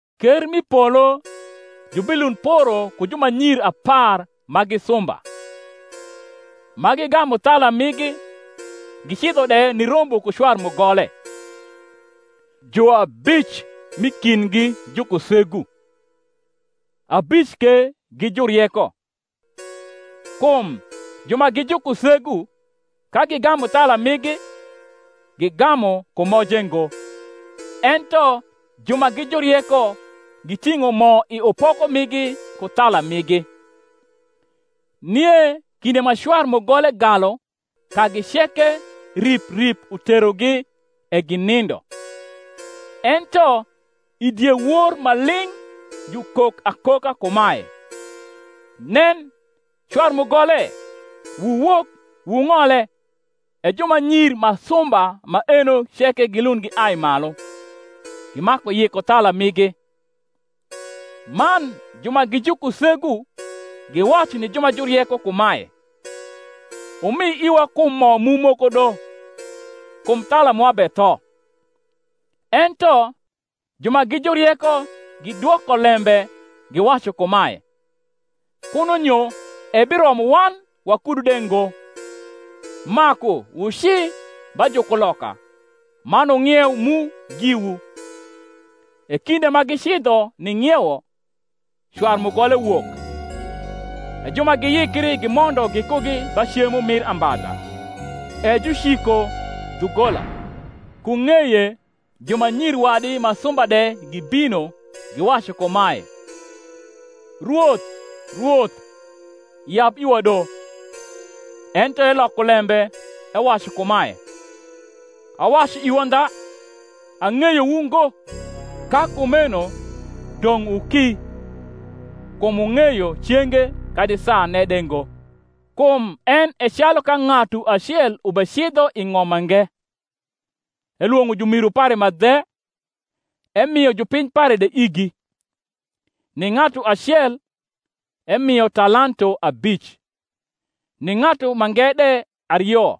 Ker mi polo jubilund poro ku jumanyir apar ma gi sumba, ma gigamu thala migi, gicidho de nirombo ku cwar mugole. Juabic m’i kindgi gi jukusegu, abic ke gi jurieko. Kum ju ma gi jukusegu, ka gigamu thala migi, gigamu ku moje ngo: ento ju ma gi jurieko giting’o mo i upoko migi ku thala migi. Nie kinde ma cwar mugole galu kagi ceke rip rip uterogi e ginindo. Ento i diewor ma ling’ jukok akoka kumae, Nen, cwar mugole! Wuwok wung’ole. E jumanyir ma sumba maeno ceke gilund giai malu, gimaku yiko thala migi. Man ju ma gi jukusegu giwacu ni ju ma jurieko kumae, Wumi iwa kum mo mu moko do; kum thala mwa betho. Ento ju ma gi jurieko gidwoko lembe, giwacu kumae, Kuno nyo ebiromo wan wakudu de ngo: maku wuci ba jukuloka, man wung’ieu mu giwu. E kinde ma gicidho ning’iewo, cwar mugole wok; e ju ma giyikri gimondo gikugi ba cemo mir ambadha: e juciko dhugola. Ku ng’eye jumanyir wadi ma sumba de gibino giwacu kumae, Rwoth, Rwoth yab iwa do. Ento eloko lembe, ewacu kumae, Awacu iwu andha, Ang’eyowu ngo. Ka kumeno dong’ wuki, kum wung’eyo cenge kadi saane de ngo. Kum en e calu ka ng’atu acel ubecidho i ng’om mange, elwong’o jumiru pare ma dhe, emio jupiny pare de igi. Ni ng’atu acel emio talanto abic, ni ng’atu mange de ario,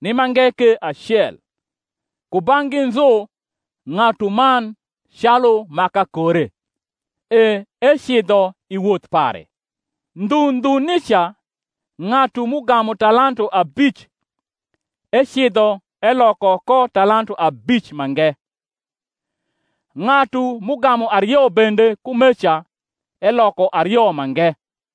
ni mange ke acel, kubang’gi nzu ng’atuman calu ma kakore; e ecidho i woth pare. Ndhu ndhu nica ng’atu m’ugamu talanto abic ecidho eloko ko talanto abic mange. Ng’atu m’ugamu ario bende kumeca eloko ario mange.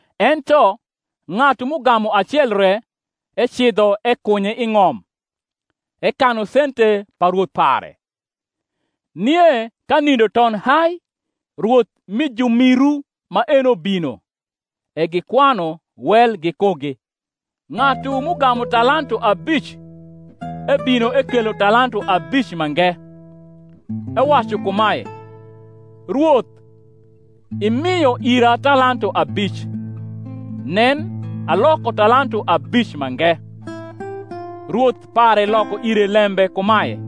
Ento ng’atu m’ugamu acel re ecidho ekunye i ng’om, ekanu sente pa rwoth pare. Nie ka nindo ton hai rwoth mi jumiru maeno bino, e gikwanu wel gikugi. Ng’atu m’ugamu talanto abic ebino ekelo talanto abic mange, ewacu kumae, Rwoth, imio ira talanto abic: nen, aloko talanto abic mange. Rwoth pare loko ire lembe kumae,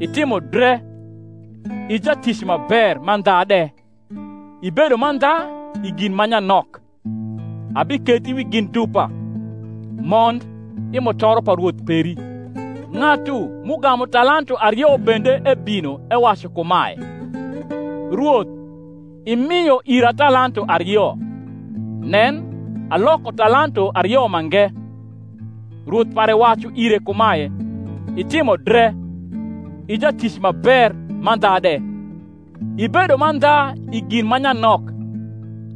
Itimo dre, i jatic ma ber mandha de: ibedo mandha i gin ma nyanok, abikethi wi gin dupa; mond i mutoro pa rwoth peri. Ng’atu m’ugamu talanto ario bende ebino ewacu kumae, Rwoth imio ira talanto ario: nen, aloko talanto ario mange. Rwoth pare wacu ire kumae, Itimo dre, i jatic ma ber mandha de: ibedo mandha i gin ma nyanok,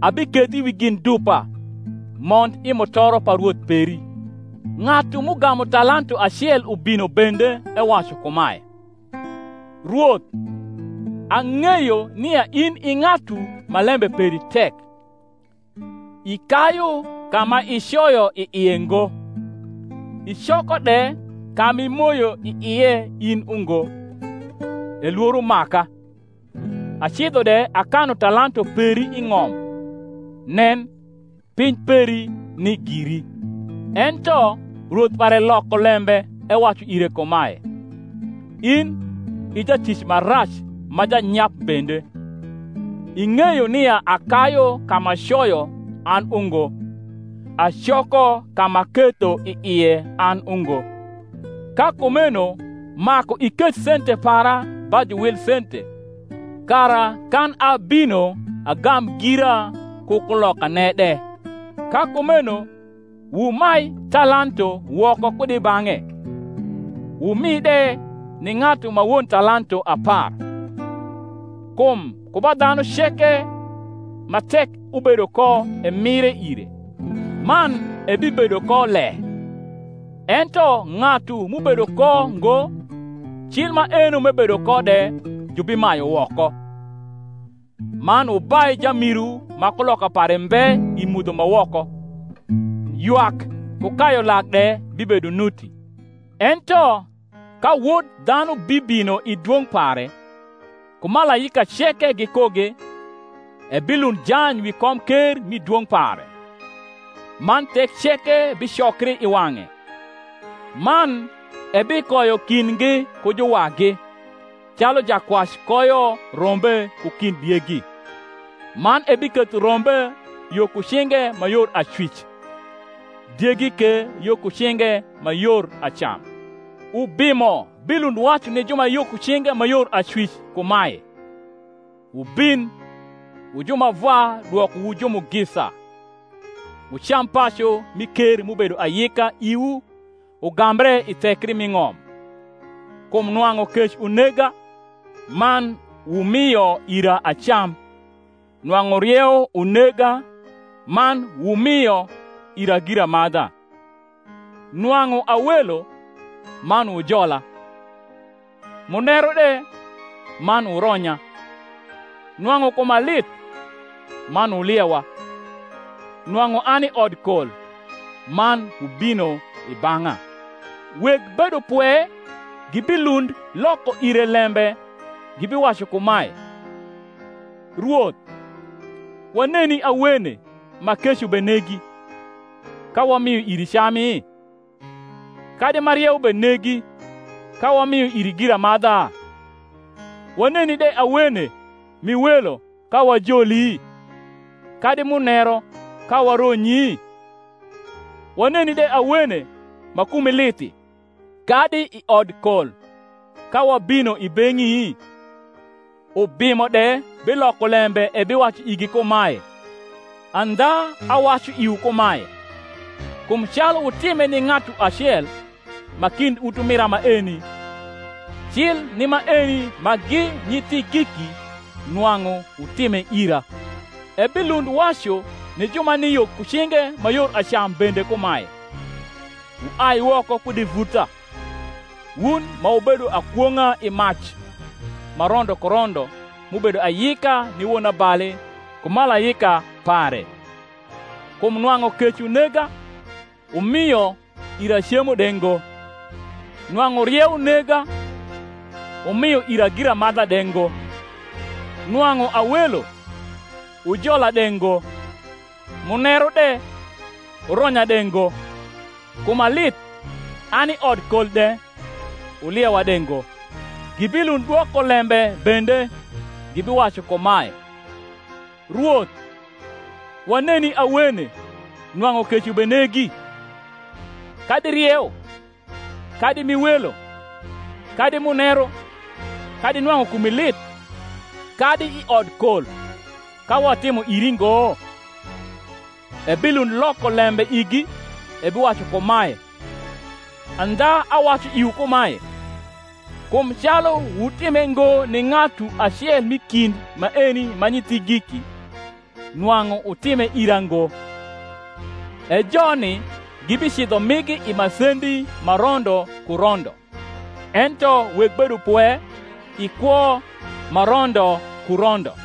abikethi wi gin dupa; mond i mutoro pa rwoth peri. Ng’atu m’ugamu talanto acel ubino bende ewacu kumae, Rwoth, ang’eyo nia in i ng’atu ma lembe peri tek, ikayu ka ma icoyo i ie ngo, icoko de ka m’imoyo i ie in ungo; e lworo maka, acidho de akanu talanto peri i ng’om: nen, piny peri ni giri. Ento rwoth pare loko lembe ewacu ire kumae, In i jatic ma rac ma janyap bende, ing’eyo nia akayu ka m’acoyo an ungo, acoko ka m’aketho i ie an ungo; ka kumeno maku iketh sente para ba juwil sente, kara kan abino agam gira ku kniokane de. Ka kumeno wumai talanto woko kud i bang’e, wumi de ni ng’atu ma won talanto apar. Kum ku ba dhanu ceke ma tek ubedo ko emire ire, man ebibedo ko le: ento ng’atu m’ubedo ko ngo, cil maeno m’ebedo ko de jubimayu woko. Man wubai jamiru ma kuloka pare mbe i mudho ma woko: ywak ku kayu lak de bibedo nuti. Ento ka Wod dhanu bibino i dwong’ pare, ku malaika ceke gikugi, ebilund jany wi komker mi dwong’ pare: man thek ceke bicokri i wang’e: man ebikoyo kindgi ku juwagi, calu jakwac koyo rombe ku kind diegi; man ebiketho rombe yo ku cinge ma yor acwic, diegi ke yo ku cinge ma yor acam. Ubimo bilund wacu ni ju ma yo ku cinge ma yor acwic kumae, Wubin wu ju ma Vwa dwokowu jumugisa, wucam pacu mi ker m’ubedo ayika iwu ugambre i thekri mi ng’om: kum nwang’u kec unega, man wumio ira acam; nwang’u rieu unega, man wumio ira giramadha; nwang’u a welo, man wujola; muneru de, man wuronya; nwang’u kuma lith, man wuliewa; nwang’u ani i odkol, man wubino i bang’a. Weg bedopwe gibilund loko ire lembe, gibiwacu kumae, Rwoth, waneni awene ma kec ubenegi, ka wamio iri cami? kadi ma rieu benegi, ka wamio iri giramadha? Waneni de awene m’i welo, ka wajoli? kadi muneru, ka waronyi? Waneni de awene ma kumi lithi, kadi i odkol, ka wabino i beng’i? Ubimo de biloko lembe ebiwacu igi kumae, Andha awacu iwu kumae, Kum calu wutime ni ng’atu acel ma kind utumira maeni, cil ni maeni ma gi nyithigiki nwang’u wutime ira. Ebilund wacu ni ju ma ni yo ku cinge ma yor acam bende kumae, Wuai woko kud i vuta, wun ma wubedo akwong’a, i mac ma rondo ku rondo m’ubedo ayika ni wonabali ku malaika pare: kum nwang’u kec unega, wumio ira cemo de ngo; nwang’u rieu nega, wumio ira giramadha de ngo; nwang’u a welo, wujola de ngo; muneru de, wuronya de ngo; kuma lith, ani i odkol de, wuliewa de ngo. Gibilund dwoko lembe bende, gibiwacu kumae, Rwoth, waneni awene nwang’u kec ubenegi, kadi rieu, kadi m’i welo, kadi muneru, kadi nwang’u kumi lith, kadi i odkol, ka watimo iri ngo? Ebilund loko lembe igi, ebiwacu kumae, Andha awacu iwu kumae, kum calu wutime ngo ni ng’atu acel mi kind maeni ma nyithigiki, nwang’u wutime ira ngo. E joni gibicidho migi i masendi ma rondo ku rondo: ento weg bedopwe i kwo ma rondo ku rondo.